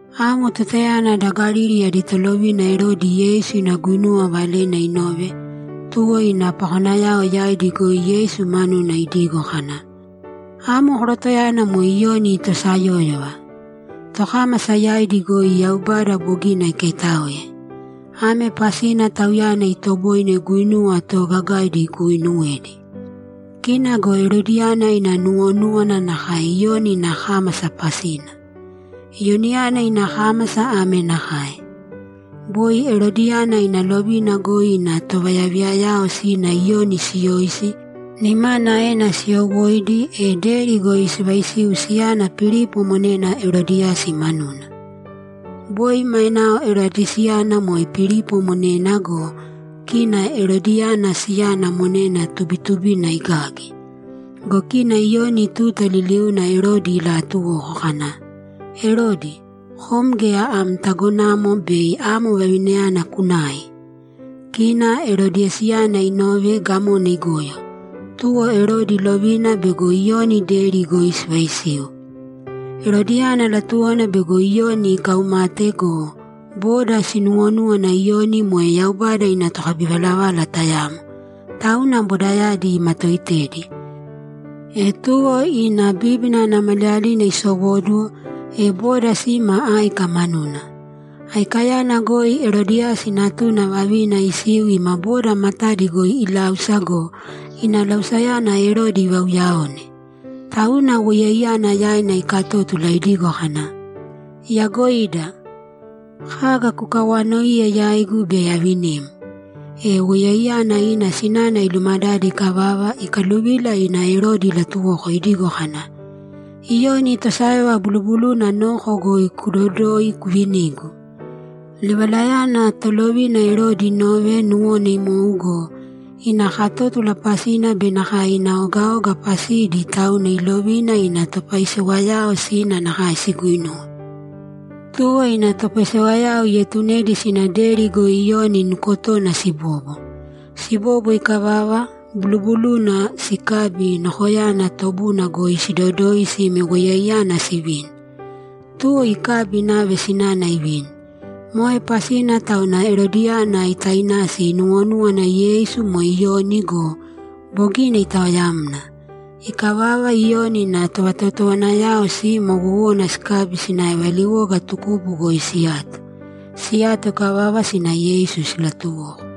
Amo tutayana da Galili adi tolovina Erodi Yeisu ina guinuwa valena inove. Tuwo ina pakonayao yaidi goi Yeisu manuna idigo kana, ‘Amo korotoyana moe Iyoni tosayóyova. Tokámasa yaidi goi Yaubada bogina ikaitáoe. Ame pasina tauyana itoboine guinuwa toogagaidi iguuinuwedi.’ Kina go Erodiyana ina nuwonúwana nakae Iyoni ina kámasa pasina. Iyoniyana ina kámasa ame nakae: Boi Erodiyana ina lovina goi ina tovayaviyayao sina Iyoni siyoisi, nimana aena siyowóidi, e deri goi sivaisiu siyana Pilipo monena Erodiyasi manuna. Boi mainao Erodiyasiyana moe Pilipo monena go, kina Erodiyana siyana monena tubitubina igagi. Go kina Iyoni tuta liliuna Erodi ilaatuwoko kana, ‘Erodi, kom geya am tagonamo bei amo vavinayana kunai!’ Kina Erodiyasiyana inove, gamona igoyo, tuwo Erodi ilovina bego Iyoni deri goi sivaisiu. Erodiyana latuwona bego Iyoni ikaumate go, boda sinuwonúwana Iyoni moe Yaubada ina tokabivalavala tayamo, tauna bodayadi imatoitedi. E tuwo ina bíbina ana maliyalina isowóduwo, e boda sima áika manuna. Aikayana goi Erodiyasi natuna vavina isiu ima boda matadi goi iláusa go, ina lausayana Erodi ivauyaone. Tauna woiyaiyana yaina ikatótula idigo kana, ‘Iyagoida! Kaga kukawanoiye yaigu, bei avinim.’ E woiyaiyana ina sinana ilumadade ikavava, ikaluvila ina Erodi ilatuwoko idigo kana, ‘Iyoni tosayóyova bulubuluna noko goi kudodōi kuvinīgu.’ Livalayana tolovina Erodi inove, nuwona imou go, ina katótula pasina be nakae ina ogaoga pasidi, tauna ilovina ina topaisewayao sina nakae siguinuwe. Tuwo ina topaisewayao ietunedi sina deri goi Iyoni nukotona sibobo. Sibobo ikavava, bulubuluna sikabi, nokoyana tobuna goi sidodoi sime woiyaiyana sivini. Tuwo ikabi inave sinana ivini. Moe pasina tauna Erodiyana itainasi inuwonúwana Yeisu moe Iyoni go, bogina itaoyamna. Ikavava, Iyoni ina tovatotowanayao sina wowona sikabi sinave valiwoga tukubu goi siyato. Siyato ikavava, sina Yeisu silatuwoko.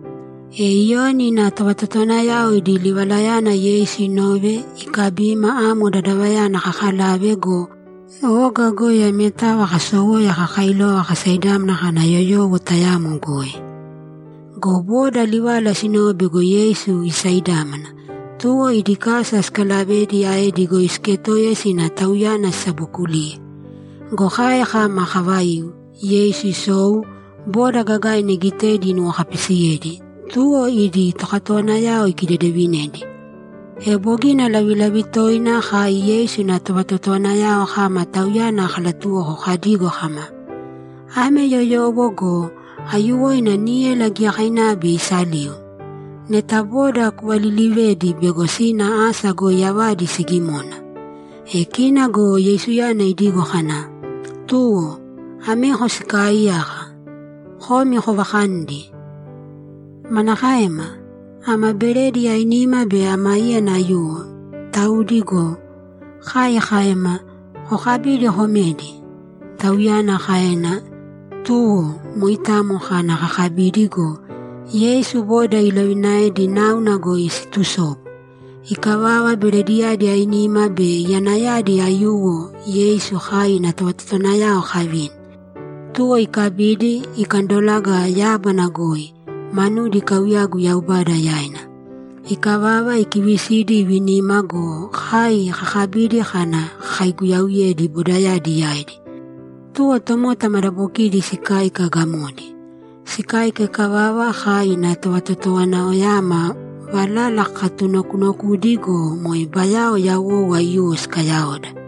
E Iyoni ina tovatotowanayao idi livalayana Yeisu inove, ikabima amo dadavayana kakalave go, oga goi ametava kasowoya kakailova kasaidámana kana yoyowo tayamo goi. Go boda livala sinove bego Yeisu isaidámana, tuwo idi kasa sikalavedi aedi goi siketoiya sina Tauyana sisabokuliye. Go kai kama kavaiu, Yeisu isou, boda gagaina igitedi inuwokapisiyedi, tuwo idi tokatowanayao ikidedevinedi. E bogina lavilavi toina kai Yeisu ina tovatotowanayao kama Tauyana kalatuwoko kadigo kama, ‘Ame yoyowo go! Aiyuwoina níyala giyakainava bei isaliu. Neta boda kuvalilivēdi bego sina asa goi avadi sigimona.’ E kina go Yeisuyana idigo kana, ‘Tuwo, ameko sikaaiyaka. Komi kovakanīdi.’ ‘Manakaema? Ama beredi ainima be ama íyana aiyuwo, taudi go!’ kai kaema. ‘Kokabīdi komēdi’, Tauyana kaena. Tuwo moitamo kana kakabidi go, Yeisu boda ilovinaedi náuna goi situsobu. Ikavava, berediyadi ainima be iyanayadi aiyuwo Yeisu kai ina tovatotowanayao kavini. Tuwo ikabidi, ikandolaga yábana goi, manudi ikauyagu Yaubada yaina. Ikavava, ikivisidi, ivinima go, kai kakabidi kana kakaiguyauyedi bodayadi yaidi. Tuwo tomota madabokidi sikáika gamodi. Sikáika ikavava, kai ina tovatotowanayaoyama valala kakatunokunokudi go, moe bayao yawou aiyuwo sikayaoda.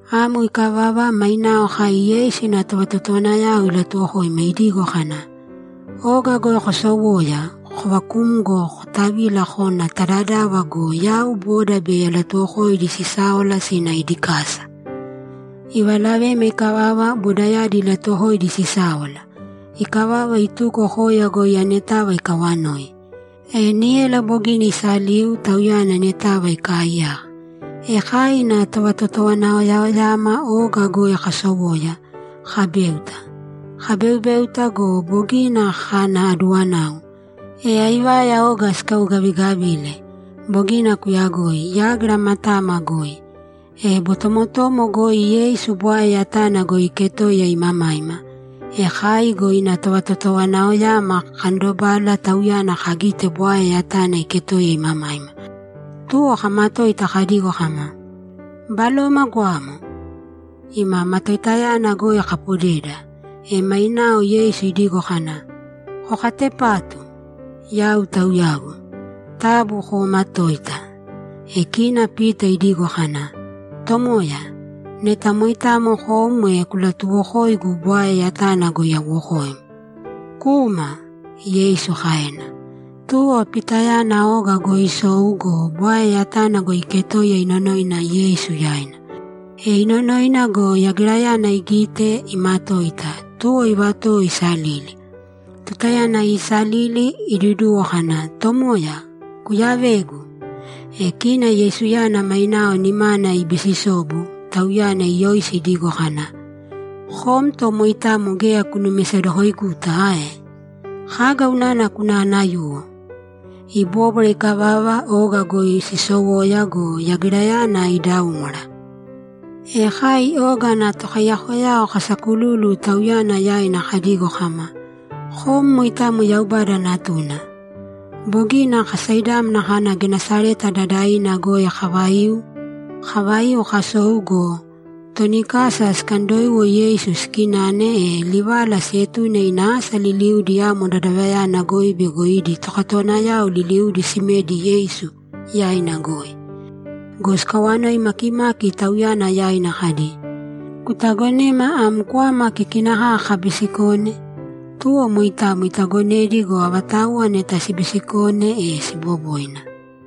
Amo ikavava, mainao kai Yeisu ina tovatotowanayao ilatuwokoima idigo kana, ‘Oga goi kosowōya, kovakūmgo kotavīla kōna ta dadava go, yau boda bei alatuwokoidi sisáwala sina idi kasa.’ Ivalavema ikavava, bodayadi ilatuwokoidi sisáwala. Ikavava, ituko koya goi anetava ikawanoi. E níyala bogina isaliu, Tauyana anetava ikaaiyaka. E kai ina tovatotowanayaoyama oga goi kasowoya, kabéuta. Kabeubéuta go, bogina kana aduwanau, e aivaya oga sikaugavigavile. Bogina kuyagoi. Yágira matama goi. E botomotomo goi Yeisu bwae yatana goi iketoiya imamaima. E kai go ina tovatotowanayaoyama kakandobala Tauyana kagite bwae yatana iketoiya imamaima, tuwo kamatoita kadigo kama, ‘Baloma goamo!’ Ima matoitayana goi kapodeda. E mainao Yeisu idigo kana, ‘Kokatepātu! Yau Tauyagu. Taabu koomatōita!’ E kina Pita idigo kana, ‘Tomoya, neta moitamo kom, e kulatuwokōigu bwae yatana goi awokoim.’ ‘Kūma!’ Yeisu kaena. Tuwo Pitayana oga goi isou go, bwae yatana goi iketoiya inonoina Yeisu yaina. E inonoina go, yagirayana igite, imatoita, tuwo ivatowo isalili. Tutayana iisalili, iduduwo kana, ‘Tomoya, kuyavēgu!’ E kina Yeisuyana mainao nimana ibisisobu, tauyana iyoisi idigo kana, ‘Kom to moitamo geya kunumisedokoiguta ae? Kaga unana kunanayuwo?’ Ibóbwara ikavava, oga goi sisowoya go, yagirayana idaúmwara. E kai oga ana tokaiyakoyao kasakululu Tauyana yaina kadigo kama, ‘Kom moitamo Yaubada Natuna.’ Bogina kasaidámana kana Genesareta dadavina goi kavaiu. Kavaiu, kasou go, toni kasa sikandoiwo Yeisu sikinane, e livala sietune ina asa liliudi amo dadavayana goi bego idi tokatowanayao liliudi simedi Yeisu yaina goi. Go sikawanoi makimaki Tauyana yaina kadi, ‘Kutagonema am kwama kikina kaka kabisikone?’ Tuwo moitamo itagonedi go, avatauwa neta sibisikone, e siboboina.